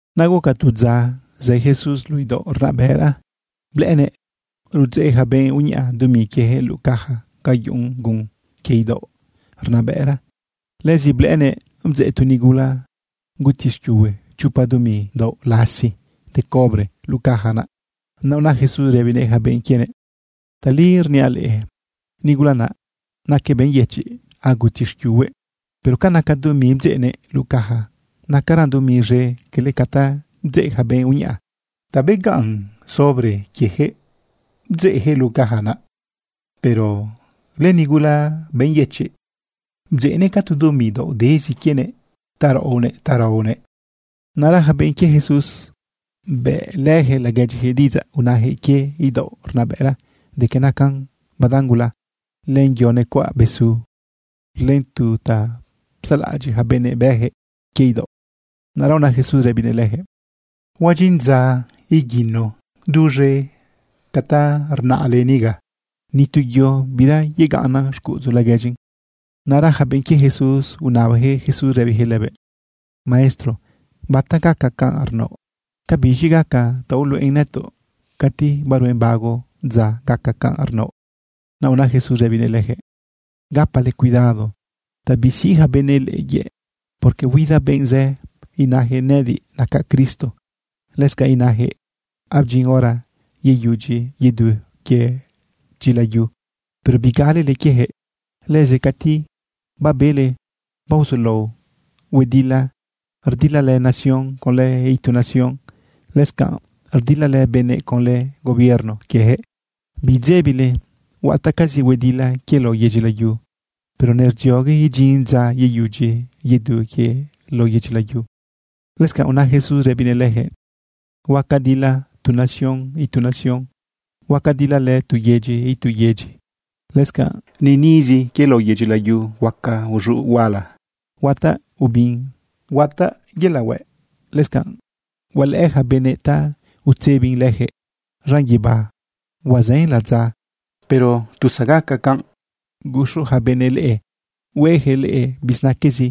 Naꞌ guca tu dza zë Jesús luꞌu idaoꞌ rnabëꞌra blëꞌënëꞌ rudzeꞌ yaca benꞌ uñaꞌa dumi quieyaquëꞌ luꞌu caja ga yuꞌun gun quie idaoꞌ rnabëꞌra. Lëzi blëꞌënëꞌ bdzeꞌ tu nigula guti xquiuhue chopa dumi daoꞌ lasi de cobre luꞌu caja naꞌ. Naꞌ una Jesús rëbinëꞌ yaca benꞌ quienëꞌ: ―Tali rniaꞌ leꞌe, nigula naꞌ naquëꞌ benꞌ yëchiꞌ, aguti xquiuhuëꞌ, pero ca naca dumi bdzeꞌnëꞌ luꞌu caja, nacaran dumi z̃e cala ca ta bdzeꞌ yaca benꞌ uñaꞌa. Ta begaꞌnnan sobre quieyaquëꞌ bdzeꞌyaquëꞌ luꞌu caja naꞌ, pero lënigula benꞌ yëchiꞌ, bdzeꞌnëꞌ ca tu dumi daoꞌ dezi quienëꞌ ta raꞌonëꞌ ta raonëꞌ. Naꞌra yaca benꞌ quie Jesús, bëꞌlëyaquëꞌ laguedyiyaquëꞌ diꞌidzaꞌ unayaquëꞌ quie idaoꞌ rnabëꞌra de que nacan badan gula, len yo necuaꞌ besu, len tu ta psalaꞌadyiꞌ yaca benëꞌ bëꞌyaquëꞌ quie idaoꞌ. Naꞌra una Jesús rëbinëꞌ leyaquëꞌ: ―Huadyin dza iguino duz̃e ca ta rnaꞌle niga. Ni tu yo bira yegaꞌnnan xcuꞌudzu laguedyin. Naꞌra yaca benꞌ quie Jesús unabayaquëꞌ Jesús rëbiyaquëꞌ lëbëꞌ: ―Maestro, ¿bata gaca canꞌ rnaoꞌ? ¿Ca biz̃i gaca ta uluꞌen nëtoꞌ cati baruen bago dza gaca canꞌ rnaoꞌ? Naꞌ una Jesús rëbinëꞌ leyaquëꞌ: ―Gapale cuidado ta bisiꞌ yaca benëꞌ leꞌe yëꞌ. Porque huida benꞌ zë inayaquëꞌ: “Nëꞌëdiꞌ nacaꞌ Cristo.” Lëscanꞌ inayaquëꞌ: “Abdyin hora yeyudyi yedu quie dyila yu.” Pero bigalele quieyaquëꞌ. Lëzi cati babele baozulao huedila, rdilalë nación conlë itu nación, lëscanꞌ rdilalë benëꞌ conlë gobierno quieyaquëꞌ, bidzebile. Huataꞌcazi huedila quie lao yedyi layu, pero nerdziogue idyin dza yeyudyi yedu quie lao yedyi layu. Lëscanꞌ una Jesús rëbinëꞌ leyaquëꞌ: ―Huaca dilalë tu nación itu nación. Huaca dilalë tu yedyi itu yedyi. Lëscanꞌ niꞌnizi quie lao yedyi layu huaca uz̃uꞌ huala, huataꞌ ubin, huataꞌ yelaꞌ hueꞌ. Lëscanꞌ hualëꞌë yaca benëꞌ ta utzebin leyaquëꞌ zaꞌn guibá huazën ladza. ’Pero tu zagaca canꞌ, guxu yaca benëꞌ leꞌe hueyaquëꞌ leꞌe bizinaquezi.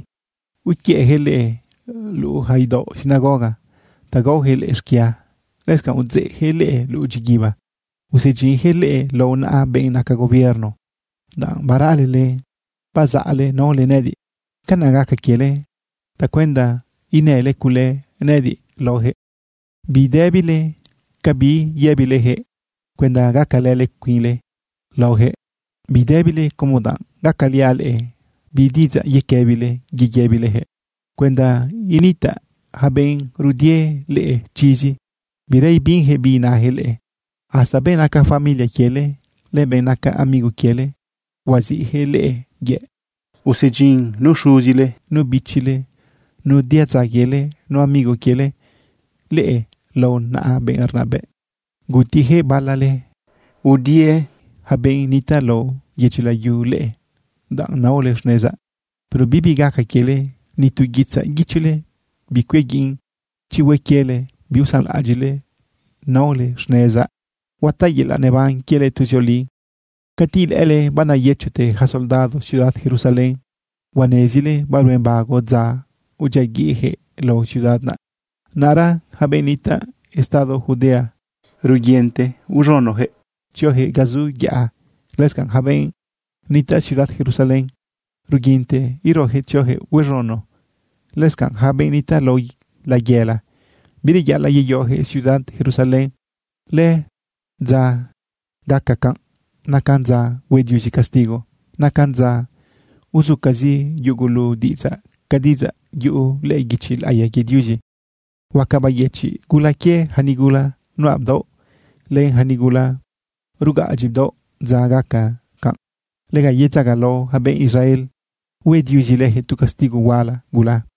Iquiëꞌyaquëꞌ leꞌe luꞌu yaca idaoꞌ sinagoga ta gaoyaquëꞌ leꞌe xquia. Lëscanꞌ udzeꞌyaquëꞌ leꞌe luꞌu dyiguiba, usedyinyaquëꞌ leꞌe lao naꞌa benꞌ naca gobierno danꞌ baralele bazaꞌle naole nëꞌëdiꞌ. Canaꞌ gaca quiele tacuenda inële cule nëꞌëdiꞌ laoyaquëꞌ. Bidëbile ca bi yëbileyaquëꞌ cuenda gacalële cuinle laoyaquëꞌ. Bidëbile como danꞌ gacaliaꞌ leꞌe bi diꞌidzaꞌ yequëbile yeyëbileyaquëꞌ cuenda initaꞌ yaca benꞌ rudie leꞌe chizi, bira ibinyaquëꞌ bi inayaquëꞌ leꞌe. Hasta benꞌ naca familia quiele, len benꞌ naca amigo quiele, huaziꞌyaquëꞌ leꞌe yëꞌ. Usedyin nu xuzile, nu bichile, nu diadza quiele, nu amigo quiele leꞌe lao naꞌa benꞌ rnabëꞌ. Gutiyaquëꞌ bala leꞌe. Huadi yaca benꞌ nitaꞌ lao yedyi layu leꞌe danꞌ naole xnezaꞌ. Pero bibi gaca quiele, ni tu guitzaꞌ guichole bicuiaguiꞌn. Chi hue quiele biusanlaꞌadyiꞌle naole xnezaꞌ, huataꞌ yelaꞌ neban quiele tuzioli. ’Cati ilëꞌële baneyëchote yaca soldado ciudad Jerusalén, huanezile baruen bago dza udyiaguiꞌyaquëꞌ lao ciudad naꞌ. Naꞌra yaca benꞌ nitaꞌ estado Judea, ruguinte iz̃unoyaquëꞌ tzioyaquëꞌ ga zu yaꞌa. Lëscanꞌ yaca benꞌ nitaꞌ ciudad Jerusalén, ruguinte eroyaquëꞌ tzioyaquëꞌ huaz̃uno. Lëscanꞌ yaca benꞌ nitaꞌ lao layela, bireyaꞌalaꞌ yeyoyaquëꞌ ciudad Jerusalén. Lëdza gaca canꞌ nacan dza hue Diuzi castigo. Nacan dza uzucazi yugulu diꞌidzaꞌ ca diꞌidzaꞌ yuꞌu lëꞌë guichi laꞌiya quie Diuzi. Huaca bayëchiꞌ gula quie yaca nigula nuꞌa bdaoꞌ, len yaca nigula rugaꞌadyi bdaoꞌ dza gaca canꞌ. Lega yedzagalao yaca benꞌ Israel, hue Diuzi leyaquëꞌ tu castigo huala gula.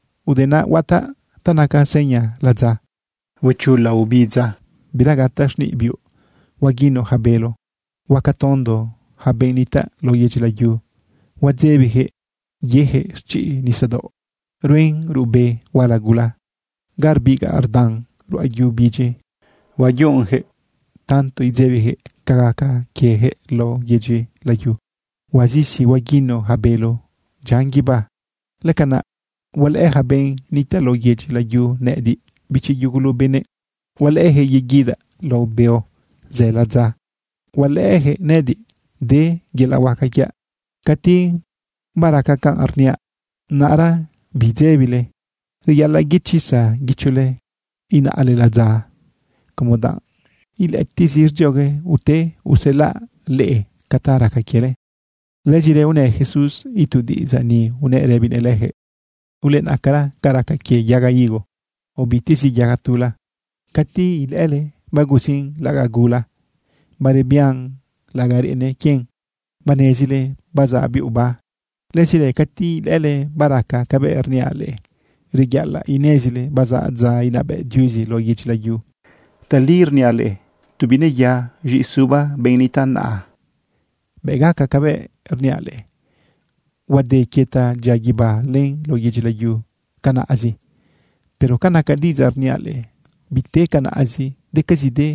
―Ude naꞌ huataꞌ ta naca seña ladza. Huechula obidza, bira gataꞌ xniꞌ biuꞌ, huaguino yaca bélo. Huaca tondo yaca benꞌ nitaꞌ lao yedyi layu. Huadzebiyaquëꞌ yeyaquëꞌ xchiꞌ nisadaoꞌ ruen ruꞌbe huala gula ga rbigaꞌ rdan ruꞌa yu bidyi. Huayunꞌyaquëꞌ tanto idzebiyaquëꞌ ca gaca quieyaquëꞌ lao yedyi layu. Huazisi huaguino yaca bélo dyian guibá. Lëcanaꞌ hualëꞌë yaca benꞌ nitaꞌ lao yedyi layu nëꞌëdiꞌ, bichi yugulu benëꞌ. Hualëꞌëyaquëꞌ yeguidaꞌ lao beo zë ladza. Hualëꞌëyaquëꞌ nëꞌëdiꞌ de yelaꞌ huaca quiaꞌ. Cati baraca canꞌ rniaꞌ, naꞌra bidzebile, reyaꞌalaꞌ yechisa guichole inaꞌle ladza como danꞌ ilëꞌëtiꞌzi rdziogue ute uselaꞌ leꞌe ca ta raca quiele. Lëzirë unë Jesús itu diꞌidzaꞌ ni, unëꞌ rëbinëꞌ leyaquëꞌ: ―Ulenaꞌcara ca raca quie yaga higo o bitezi yaga tula. Cati ilëꞌële bagusin laꞌagaꞌ gula, barebian laꞌagaꞌ reꞌene quien, banezile bazaꞌ biuꞌ oba. Lëzirë cati ilëꞌële baraca cabëꞌ rniaꞌ leꞌe, reyaꞌalaꞌ inezile bazaꞌ dza inabëꞌ Diuzi lao yedyi layu. ’Tali rniaꞌ leꞌe, tu bineya z̃iꞌisuba benꞌ nitaꞌ naꞌa, bëꞌ gaca cabëꞌ rniaꞌ leꞌe. Huade quie ta dyia guibá len lao yedyi layu canaꞌzi, pero ca naca diꞌidzaꞌ rniaꞌ leꞌe, biten canaꞌzi. Decazide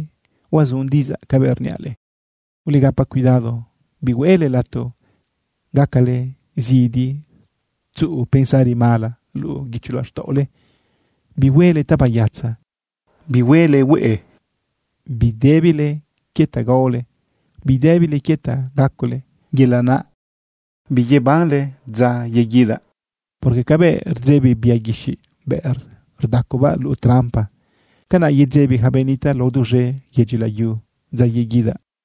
huazun diꞌidzaꞌ cabëꞌ rniaꞌ leꞌe. ’Ulegapa cuidado, bihueꞌle lato gacale zidi tzuꞌu pensari mala luꞌu guicho laxtaꞌole. Bihuele tabayatza, bihuele hueꞌe, bidëbile quie ta gaole, bidëbile quie ta gacole, yelaꞌ naꞌ biyebanle dza yeguidaꞌ. Porque cabëꞌ rdzebi bia guixiꞌ bëꞌ rdacobaꞌ luꞌu trampa, canaꞌ yedzebi yaca benꞌ nitaꞌ lao duz̃e yedyi layu dza yeguidaꞌ.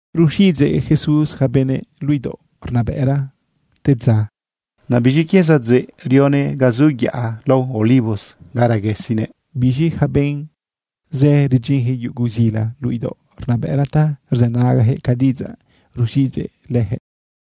Ruxiꞌidzeꞌ Jesús yaca benëꞌ luꞌu idaoꞌ rnabëꞌra te dza. Naꞌ biz̃i quie sadzeꞌ rionëꞌ ga zu yaꞌa lao Olivos ga reguesinëꞌ. Biz̃i yaca benꞌ zë rdyinyaquëꞌ yugu zila luꞌu idaoꞌ rnabëꞌra ta rzënagayaquëꞌ ca diꞌidzaꞌ ruxiꞌidzëꞌ leyaquëꞌ.